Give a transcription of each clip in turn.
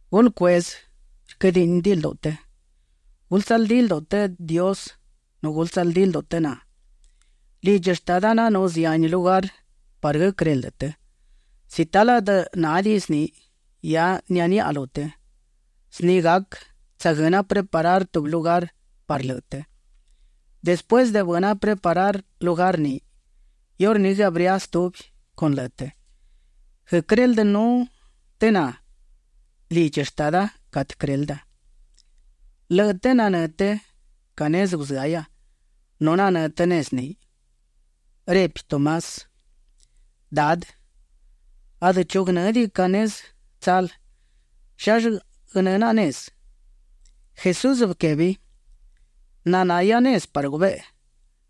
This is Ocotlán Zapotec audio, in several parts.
’Gulë cueꞌzë rquëdiꞌni lduꞌu të. Gulë tsaldí lduꞌu të Dios nu gulë tsaldí lduꞌu të na. Lidchi Shtada nanú zihani lugar parë guëquëreldë të; si talë adë nádiꞌin zni, hia nianíꞌihia lu të. Zni gac tsaguëna preparar tubi lugar parë lëꞌë të. Despuësë de bëna preparar lugar ni, iurní guëabría stubi con lëꞌë të, guëquëreldënú të na lidchi Shtada catë quërelda. Lëꞌë të nanë́ të ca nezë guzëahia nu nanë́ të nezë ni. Repi Tomás: ―Dadë, adë chu guënë́diꞌi ca nezë tsal. ¿Llallë guënë́ naꞌa nezë? Jesús bëquebi: ―Nahia nezë parë gubeꞌe;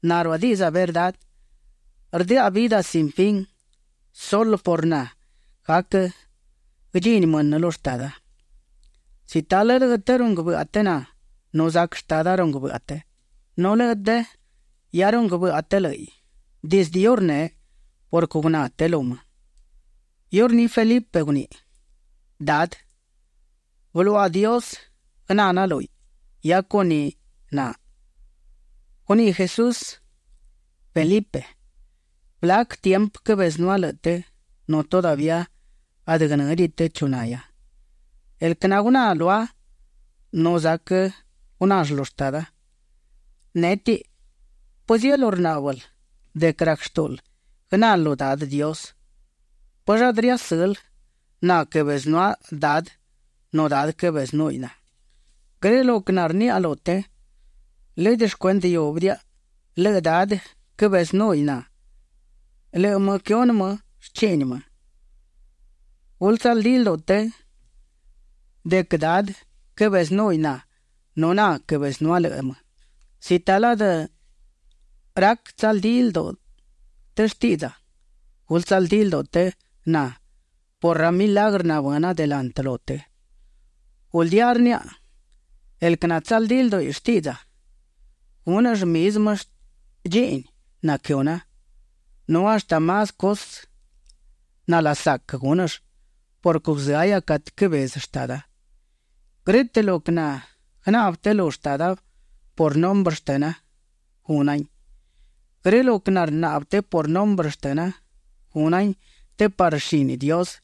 na ruadiꞌdza verdá; rdëꞌa vidë sin fin; sulë por na gac guëdchini mënë lu Shtada. Si talë lëꞌë të runguë bëꞌa të na, nu zac Shtada runguë bëꞌa të. Nu lëꞌë të hia runguë bëꞌa të lë́ꞌiꞌ dizdë iurneꞌ purquë guná të lu më. Iurní Felipe guniꞌi: ―Dadë, bëluaꞌa Dios guëná naꞌa lúhiꞌ, hia con ni naꞌ. Guniꞌi Jesús: ―Felipe, ¿blac tiempë quëbezënúa lëꞌë të nu todavía adë guënë́diꞌi të chu nahia? El quë naguná lua nu zac gunall lu Shtada. Nétiꞌi, ¿pëzielú rnáꞌbël de quë rac shtúꞌul guënal lu Dadë Dios? ¿Pëllë adë riasël na quëbezënúa Dadë nu Dadë quëbezënúhiꞌ na? Grë lo quë narniaꞌa lu të, lëdë shcuendë iúbidiaꞌa; lëꞌë Dadë quëbezënúhiꞌ na; lëꞌë më quëhunë më shchiꞌni më. Gulë tsaldí lduꞌu të de quë Dadë quëbezënúhiꞌ na nu na quëbezënúa lëꞌë më. Si talë adë rac tsaldídiꞌi lduꞌu të shtiꞌdza, gulë tsaldí lduꞌu të na por ra milagrë nabëna delantë lu të. Guldía rniaꞌa, el quë natsaldí lduꞌi shtiꞌdza, gúnëll mizmë dchiꞌni naquëhuna, nu hashtë más cusë nalasac gúnëll purquë guzëahia catë quëbezë Shtada. Grë́tëꞌ lo quë naguënaꞌbë të lu Shtada por nombre shtëna, gúnahin. Grë lo quë narnaꞌbë të por nombre shtëna, gúnahin të parë shini Dios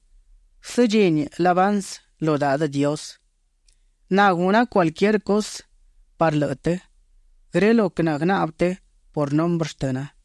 guësëdchini labansë lu Dadë Dios. Na guna cualquier cusë parë lëꞌë të, grë lo quë naguënaꞌbë të por nombre shtëna.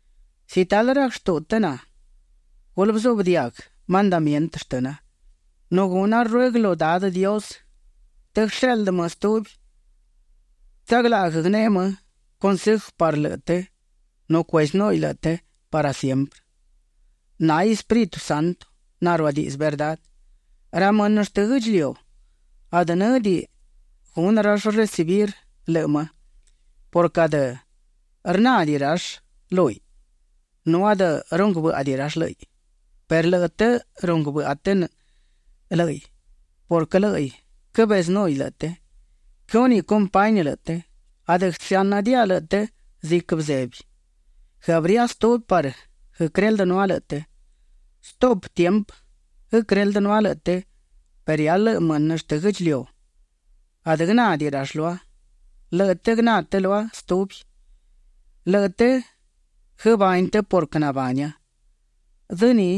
’Si talë rac shtuꞌu të na, gulë bëzuꞌbë diaguë mandamientë shtëna. Nu guna ruëguë lu Dadë Dios të guësheꞌldë më stubi natsaglaꞌguë guëneꞌe cunseju parë lëꞌë të nu cuezënúhiꞌ lëꞌë të parë siemprë. Náhiꞌ Espíritu Santo naruadiꞌdzë verdá. Ra mënë shtë guë́ꞌdchiliu, adë në́diꞌi gunë rall recibir lëꞌë më purquë adë rnádiꞌi rall lúhiꞌ nu adë runguë bë́ꞌadiꞌi rall lë́ꞌiꞌ; perë lëꞌë të runguë bëꞌa të lë́ꞌiꞌ purquë lë́ꞌiꞌ quëbezënúhiꞌ lëꞌë të. Quëhúniꞌ compañi lëꞌë të. Adë guësëáꞌnëdiaꞌa lëꞌë të ziquë bëzebi. Guëabría stubi parë guëquëreldënúa lëꞌë të. Stuꞌpë tiempë quëreldënúa lëꞌë të perë hia lëꞌë mënë shtë guë́ꞌdchiliu, adë guënádiꞌi rall lua. Lëꞌë të guëná të lua stubi. Lëꞌë të guëbani të purquë nabania. Dzë ni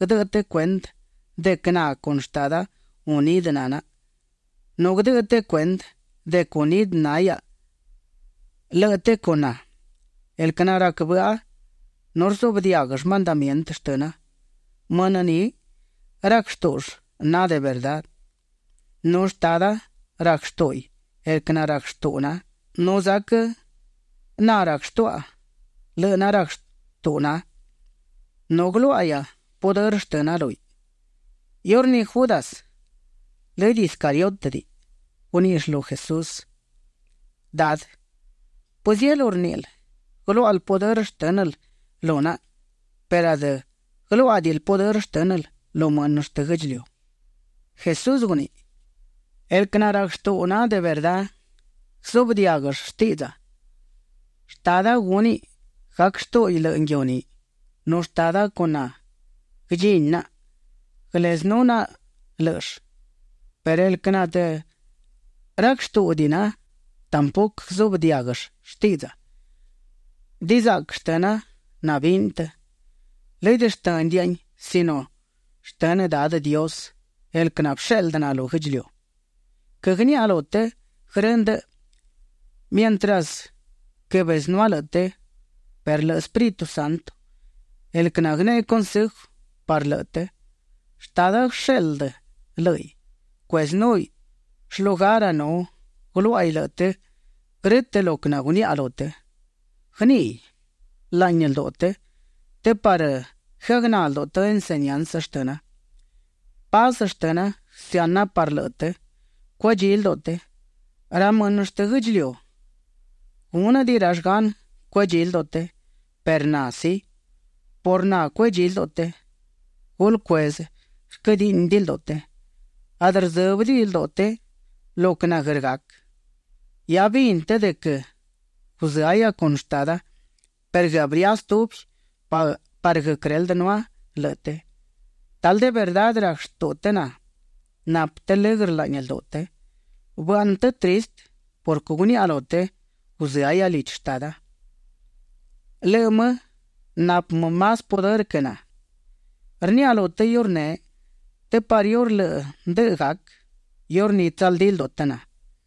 guëdëꞌë të cuendë de quë na con Shtada unidë na naꞌa, nu guëdëꞌë të cuendë de quë unidë na hiaꞌa, lëꞌë të con na. El quë narac bëꞌa nu rzuꞌbë diáguëll mandamientë shtëna, mënë ni rac shtúꞌull na de verdá. Nu Shtada rac shtúꞌuiꞌ el quë narac shtuꞌu na, nu zac na rac shtuaꞌa lëꞌë narac shtuꞌu na. Nu guëluáꞌahia pudërë shtëna lúhiꞌ. Iurní Judas, lëdë Iscariótëdiꞌi, guníꞌill lu Jesús: ―Dadë, ¿pëzielú rníꞌil guëluáꞌal pudërë shtë́nël lu naꞌa perë adë guëluáꞌadiꞌil pudërë shtë́nël lu mënë shtë guë́ꞌdchiliu? Jesús guniꞌi: ―El quë narac shtuꞌu na de verdá, guëzuꞌbë diáguëll shtiꞌdza. Shtada gúniꞌ gac shtúꞌuiꞌ lëꞌë nguiu ni, nu Shtada con na guëdchini naꞌa; guëlezënú naꞌa lë́ꞌëll. Perë el quë adë rac shtúꞌudiꞌi na, tampuquë guëzuꞌbë diáguëll shtiꞌdza. Dizaꞌquë shtëna nabini të, lëdë shtë́nëdiaꞌain sino shtënë Dadë Dios, el quë nabësheꞌldë na lu guë́ꞌdchiliu. ’Quëgniaꞌa lu të grë ndëꞌë mientras quëbezënúa lëꞌë të perë lëꞌë Espíritu Santo, el quë naguëneꞌe cunseju parë lëꞌë të, Shtada guësheꞌldë lë́ꞌiꞌ; cuezënúhiꞌ shlugara nu guëluáꞌaiꞌ lëꞌë të grë́tëꞌ lo quë naguniaꞌa lu të. Guëníꞌiꞌ laꞌni lduꞌu të, të parë guëagná lduꞌu të enseñansë shtëna. ’Paz shtëna guësëana parë lëꞌë të, cuedchí lduꞌu të. Ra mënë shtë guë́ꞌdchiliu gúnëdiꞌi rall gan cuedchí lduꞌu të perë na sí, por na cuedchí lduꞌu të. Gulë cueꞌzë rquëdiꞌni lduꞌu të. Adë rdzë́bëdiꞌi lduꞌu të lo quë naguër gac. Hia bini të de quë guzëahia con Shtada perë guëabría stubi parë guëquëreldënúa lëꞌë të. Talë de verdá rac shtuꞌu të na, napë të lëgrë laꞌni lduꞌu të. Bëaꞌnë të tristë purquë guniaꞌa lu të: “Guzëahia lidchi Shtada”. Lëꞌë më napë më más pudërë quë na. Rniaꞌa lu të iurneꞌ të parë iurë lëꞌë ndëꞌë gac, iurní tsaldí lduꞌu të na.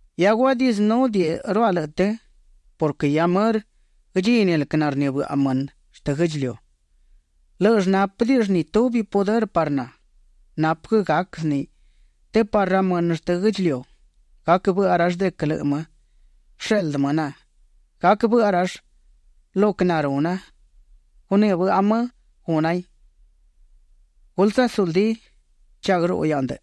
’Hiadë guadiꞌdzënúdiꞌiruaꞌa lëꞌë të purquë hia mërë guëdchini el quë narnibëꞌa mënë shtë guë́ꞌdchiliu. Lë́ꞌëll nápëdiꞌill ni tubi pudërë parë na. Napë quë gac zni të parë ra mënë shtë guë́ꞌdchiliu, gac bëꞌa rall de quë lëꞌë më bësheꞌldë më na. Gac bëꞌa rall lo quë naruna, gunibëꞌa më gúnahin. ’Gulë tsasuldí. Cha guëruꞌu hiaꞌa de ndëꞌë.